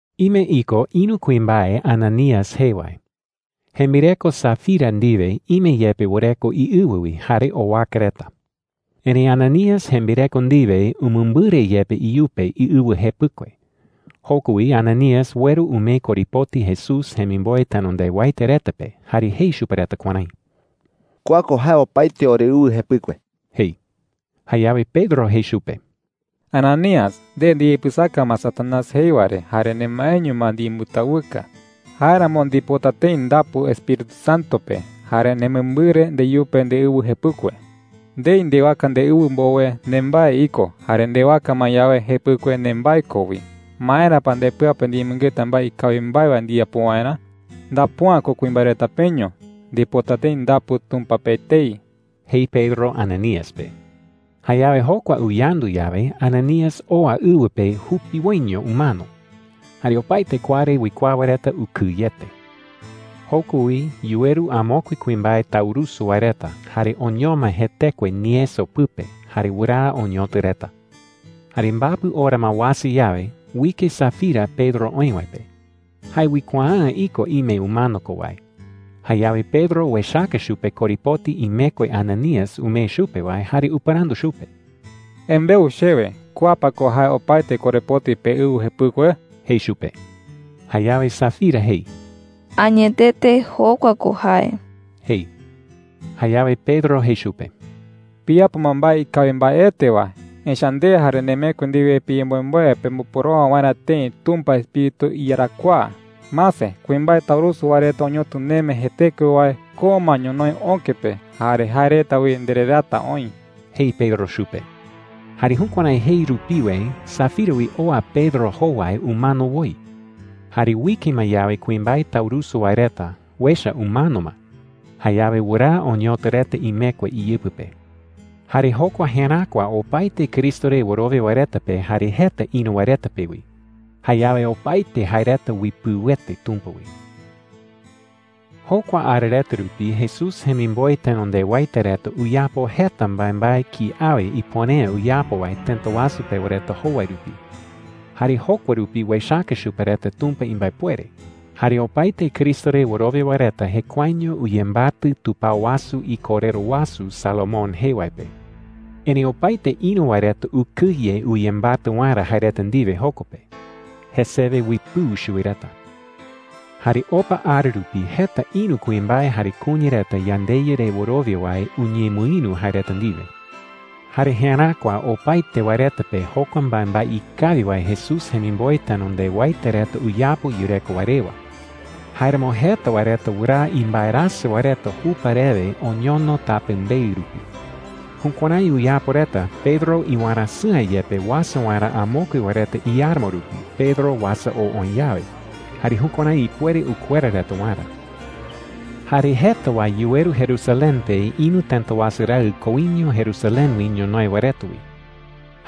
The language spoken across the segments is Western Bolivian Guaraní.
Ime iko ïru kuimbae, Ananías jee wae. Jembireko Safira ndiwe ime yepe wɨreko iɨwɨ wi, jare owaka reta. Erëi Ananías jembireko ndiwe umɨmbɨre yepe iyupe iɨwɨ jepɨkue. Joko wi Ananías ueru umee korepoti Jesús jemimboe tenondewaete reta pe jare jei chupe reta kuärái: “Kua ko opaete oreɨwɨ jepɨkue,” jei. Jayawe Pedro jei chupe: “Ananías, nde ndiyapɨsaka ma Satanás Añawasu jee ko “Satanás.” jei wae re jare nemaeño ma ndiyembɨtawɨka. Jáeramo ndipota tëi ndapu Espíritu Santo pe, jare nemɨmbɨre ndeyupe ndeɨwɨ jepɨkue,” jei. “Ndei ndewaka ndeɨwɨ mbowe, nembae iko. Jare ndewaka ma yawe, jepɨkue nembae ko wi. ¿Maera pa ndepɨa pe ndiyemɨngeta mbae ikawi mbae wae ndiyapo waerä? Ndapu’ä ko kuimbae reta peño. Ndipota tëi ndapu Tumpa pe etei,” jei Pedro Ananías pe. Jayawe jokua uyandu yawe, Ananías oa ɨwɨ pe jupiwoiño umano. Jare opaete kua re uikuaa wae reta ukɨyete. Joko wi yuweru amokue kuimbae taurusu wae reta, jare oñoma jetekue nieso pɨpe, jare wɨraa oñotɨ reta. Jare mbapɨ ora ma uasa yawe, uike Safira Pedro oï wae pe. Jae uikuaa’ä iko ime umano ko wae. Jayawe Pedro uechaka chupe korepoti imekue Ananías umee chupe wae, jare upɨrandu chupe: “Embeu chewe, ¿kua pa ko jae opaete korepoti peɨwɨ jepɨkue?” jei chupe. Jayawe Safira jei: “Añetete, jokua ko jae,” jei. Jayawe Pedro jei chupe: “Piyapo ma mbae ikawi mbaete wae. Echa’ä nde jare nemekue ndiwe piyemboemboe pemboporowa waerä tëi Tumpa iEspíritu iyarakuaa. Mase, kuimbae taurusu wae reta oñotɨ neme jetekue wae, ko ma ñonoï öke pe. Jare jae reta wi ndereraata oï,” jei Pedro chupe. Jare jukuärái jei rupiwe Safira wi oa Pedro jowai umano woi. Jare uike ma yawe kuimbae taurusu wae reta, uecha umano ma. Jayawe wɨraa oñotɨ reta imekue iyɨpɨ pe. Jare jokua jeräkua opaete Cristo re wɨrowia wae reta pe, jare jeta ïru wae reta pe wi. Jayawe opaete jae reta uipɨuete Tumpa wi. Jokua ara reta rupi Jesús jemimboe tenondewaete reta uyapo jeta mbaembae kiawe ipuere’ä uyapo wae tëta wasu pewa reta jowai rupi. Jare jokua rupi uechaka chupe reta Tumpa imbaepuere. Jare opaete Cristo re wɨrowia wae reta jekuaeño uyembatɨ tupao wasu ikorero wasu Salomón jee wae pe. Erëi opaete ïru wae reta ukɨye uyembatɨ waerä jae reta ndiwe joko pe. Jesewe uipɨu chuwi reta. Jare opa ara rupi jeta ïru kuimbae jare kuña reta yandeYa re wɨrowia wae uñemɨïru jae reta ndiwe. Jare jeräkua opaete wae reta pe jokua mbaembae ikawi wae Jesús jemimboe tenondewaete reta uyapo yureko wae rewa. Jáeramo jeta wae reta wɨraa imbaerasɨ wae reta jupa rewe oñono tapembeɨ rupi. Jukuärái uyapo reta Pedro iwarasɨ̈a yepe uasa waerä amokue wae reta iáramo rupi Pedro uasa oo oï yawe, jare jukuärái ipuere ukuera reta waerä. Jare jeta wae yuweru Jerusalén pe ïru tëta wasu raɨ koiño Jerusalén wi ñonoï wae reta wi.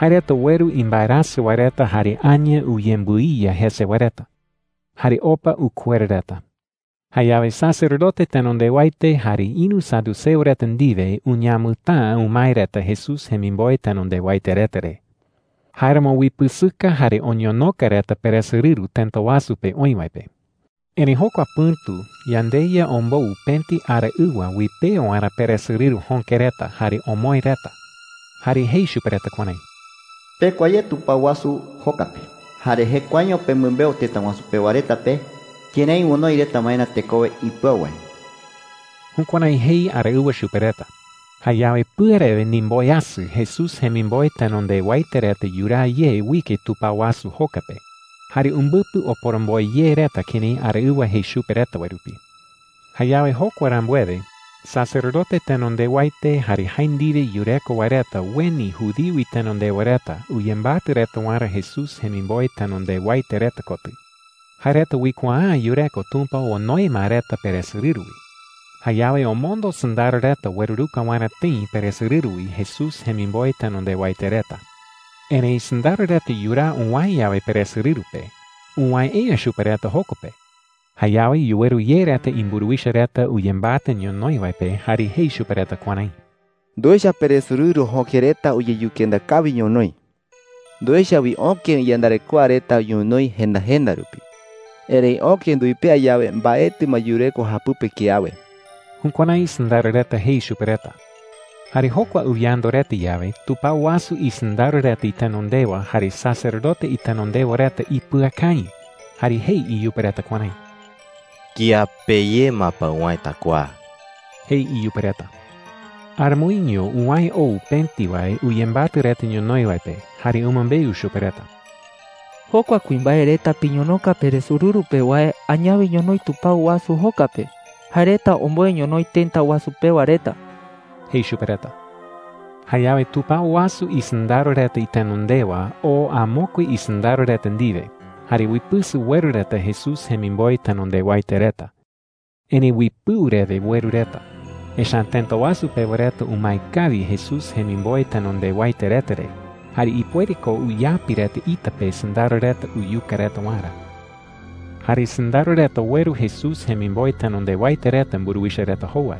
Jae reta ueru imbaerasɨ wae reta jare aña uyembɨiya jese wae reta. Jare opa ukuera reta. Jayawe sacerdote tenondewaete jare ïru saduceo reta ndiwe uñamɨtäa umae reta Jesús jemimboe tenondewaete reta re. Jáeramo uipɨsɨka jare oñonoka reta peresorɨru tëta wasu pe oï wae pe. Erëi jokua pɨ̈tu yandeYa ombou pëti araɨwa uipea waerä peresorɨru jöke reta jare omoë reta. Jare jei chupe reta kuärái: “Pekua ye tupao wasu joka pe, jare jekuaeño pemɨmbeu tëta wasu pewa reta pe kërái onoi reta waerä tekowe ipɨau wae.” Jukuärái jei araɨwa chupe reta. Jayawe pɨarewe ndimboweasɨ Jesús jemimboe tenondewaete reta yuraa ye uike tupao wasu joka pe. Jare umbɨpɨ oporomboe ye reta kërái araɨwa jei chupe reta wae rupi. Jayawe jokua rambuewe, sacerdote tenondewaete jare jae ndiwe yureko wae reta ueni judío itenondewa reta uyembatɨ reta waerä Jesús jemimboe tenondewaete reta kotɨ. Jae reta uikuaa’ä yureko Tumpa onoe ma reta peresorɨru wi. Jayawe omondo sɨndaro reta ueruruka waerä tëi peresorɨru wi Jesús jemimboe tenondewaete reta. Erëi sɨndaro reta yuraa uwäe yawe peresorɨru pe, uwäe’ä chupe reta joko pe. Jayawe yuweru ye reta imburuwicha reta uyembatɨ ñonoï wae pe jare jei chupe reta kuärái: “Nduecha peresorɨru jöke reta uyeyukenda kawi ñonoï,” jei reta. “Nduecha wi öke iyandarekoa reta ñonoï jenda jenda rupi. Erëi öke nduipea yawe, mbaetɨ ma yureko japɨpe kiawe.” Jukuärái sɨndaro reta jei chupe reta. Jare jokua uyandu reta yawe, tupao wasu isɨndaro reta itenondewa jare sacerdote itenondewa reta ipɨakañɨ, jare jei iyupe reta kuärái: “¿Kiape ye ma pa uwäeta kua?” jei iyupe reta. Aramoiño uwäe ou pëti wae uyembatɨ ñonoï reta wae pe jare umɨmbeu chupe reta: “Jokua kuimbae reta piñonoka peresorɨru pe wae añawe ñonoï tupao wasu joka pe. Jae reta omboe ñonoï tëta wasu pewa reta,” jei chupe reta. Jayawe tupao wasu isɨndaro reta itenondewa oo amokue isɨndaro reta ndiwe jare uipɨsɨ ueru reta Jesús jemimboe tenondewaete reta. Erëi uipɨu rewe ueru reta. Echa’ä tëta wasu pewa reta umae kawi Jesús jemimboe tenondewaete reta re jare ipuere ko uyapi reta ita pe sɨndaro reta uyuka reta waerä. Jare sɨndaro reta ueru Jesús jemimboe tenondewaete reta mburuwicha reta jowai.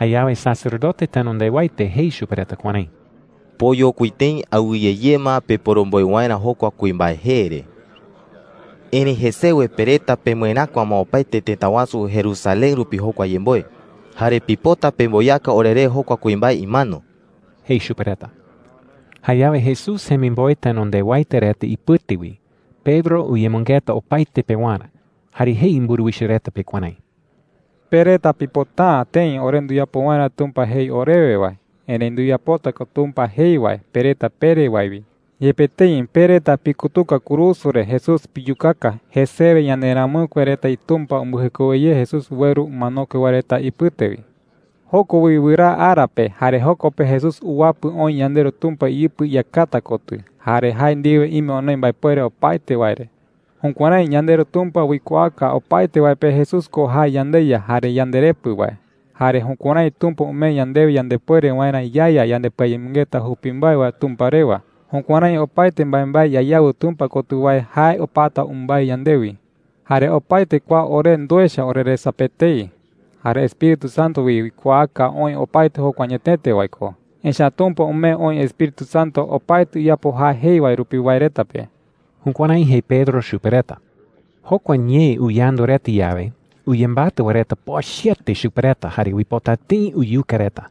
Jayawe sacerdote tenondewaete jei chupe reta kuärái: “Poyokui tëi awɨye ye ma peporomboe waerä jokua kuimbae jee re,” jei. “Erëi jesewe pe reta pemɨeräkua ma opaete tëta wasu Jerusalén rupi jokua yemboe. Jare pipota pemboyaka oreré jokua kuimbae imano,” jei chupe reta. Jayawe Jesús jemimboe tenondewaete reta ipɨte wi Pedro uyemɨngeta opaete pewarä, jare jei mburuwicha reta pe kuärái: “Pe reta pipota’ä tëi ore nduyapo waerä Tumpa jei orewe wae. Erëi nduyapota ko Tumpa jei wae, pe reta pere wae wi,” jei chupe reta. “Yepe tëi pe reta pikutuka kurusu re Jesús piyukaka, jesewe yanderamɨkue reta iTumpa umbɨjekowe ye Jesús ueru umanokue wae reta ipɨte wi. Joko wi wɨraa ara pe. Jare joko pe Jesús uwapɨ oï yandeRu Tumpa iyɨpɨ iyakata kotɨ, jare jae ndiwe ime onoi mbaepuere opaete wae re,” jei. “Jukuärái yandeRu Tumpa uikuaaka opaete wae pe Jesús ko jae yandeYa jare yandeRepɨ wae. Jare jukuärái Tumpa umee yandewe yandepuere waerä yaeya yandepɨayemɨngeta jupi mbae wae Tumpa rewa. Jukuärái opaete mbaembae yayawɨ Tumpa kotɨ wae jae opata umbái yandewi,” jei. “Jare opaete kua ore nduecha oreresa pe etei. Jare Espíritu Santo wi uikuaaka oï opaete jokua añetete wae ko. Echa’ä Tumpa umee oï Espíritu Santo opaete uyapo jae jei wae rupi wae reta pe.” Jukuärái jei Pedro chupe reta. Jokua ñee uyandu reta yawe, uyembatɨ wae reta pochɨete chupe reta jare uipota tëi uyuka reta.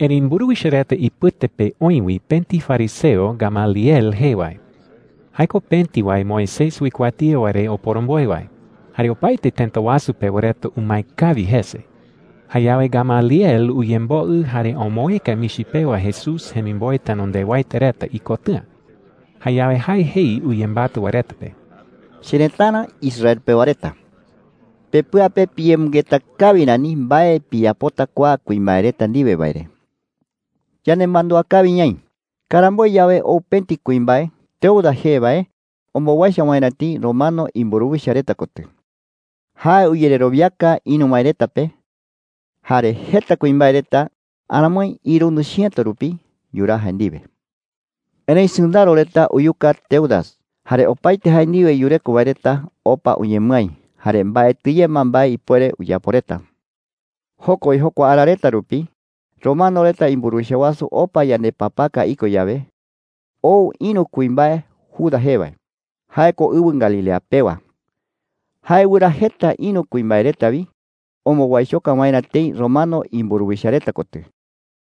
Erëi mburuwicha reta ipɨte pe oï wi pëti fariseo Gamaliel jee wae. Jae ko pëti wae Moisés uikuatía wae re oporomboe wae, jare opaete tëta wasu pewa reta umae kawi jese. Jayawe Gamaliel uyemboɨ jare omoëka michi pewa Jesús jemimboe tenondewaete reta ikotɨ̈a. Jayawe jae jei uyembatɨ wae reta pe: “Cherëtara Israel pewa reta, pepɨa pe piyemɨngeta kawi rani mbae piyapota kua kuimbae reta ndiwe wae re,” jei. “Yanemandúa kawi ñaï, karamboe yawe ou pëti kuimbae Teudas jee wae ombowaicho waerä tëi romano imburuwicha reta kotɨ. Jae uyererowiaka ïru wae reta pe. Jare jeta kuimbae reta – aramoi irundɨ chiëto rupi – yuraa jae ndiwe,” jei. “Erëi sɨndaro reta uyuka Teudas. Jare opaete jae ndiwe yureko wae reta opa uñemɨái, jare mbaetɨ ye ma mbae ipuere uyapo reta,” jei. “Joko wi, jokua ara reta rupi romano reta imburuwicha wasu opa yandepapaka iko yawe, ou ïru kuimbae Judas jee wae. Jae ko ɨwɨ Galilea pewa. Jae wɨraa jeta ïru kuimbae reta wi ombowaichoka waerä tëi romano imburuwicha reta kotɨ.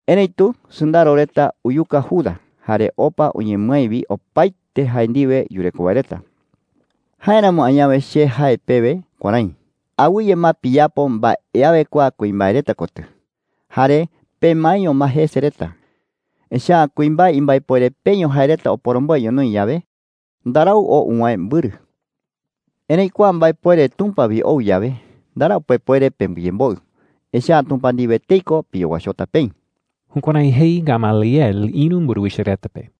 Erëitu sɨndaro reta uyuka Judas jare opa uñemɨái wi opaete jae ndiwe yureko wae reta,” jei. “Jáeramo añawe che jae pewe kuärái: Awɨye ma piyapo mbae awe kua kuimbae reta kotɨ, jare pemaeño ma jese reta. Echa’ä kuimbae imbaepuere peño jae reta oporomboe ñonoï yawe, ndarau oo uwäe mbɨrɨ,” jei. “Erëi kua mbaepuere Tumpa wi ou yawe, ndarau pepuere pembɨyemboɨ, echa’ä Tumpa ndiwe etei ko piyowaichota peï.” Jukuärái jei Gamaliel ïru mburuwicha reta pe.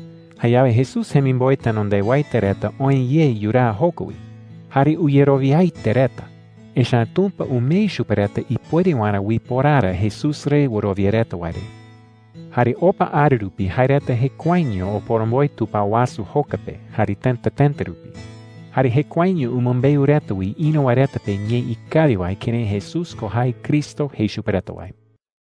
Jayawe Jesús jemimboe tenondewaete reta oë ye yuraa joko wi. Jare uyerowiaete reta, echa’ä Tumpa umee chupe reta ipuere waerä uiporara Jesús re wɨrowia reta wae re. Jare opa ara rupi jae reta jekuaeño oporomboe tupao wasu joka pe jare tëta tëta rupi. Jare jekuaeño umɨmbeu reta wi ïru wae reta pe ñee ikawi wae kërái Jesús ko jae Cristo jei chupe reta wae.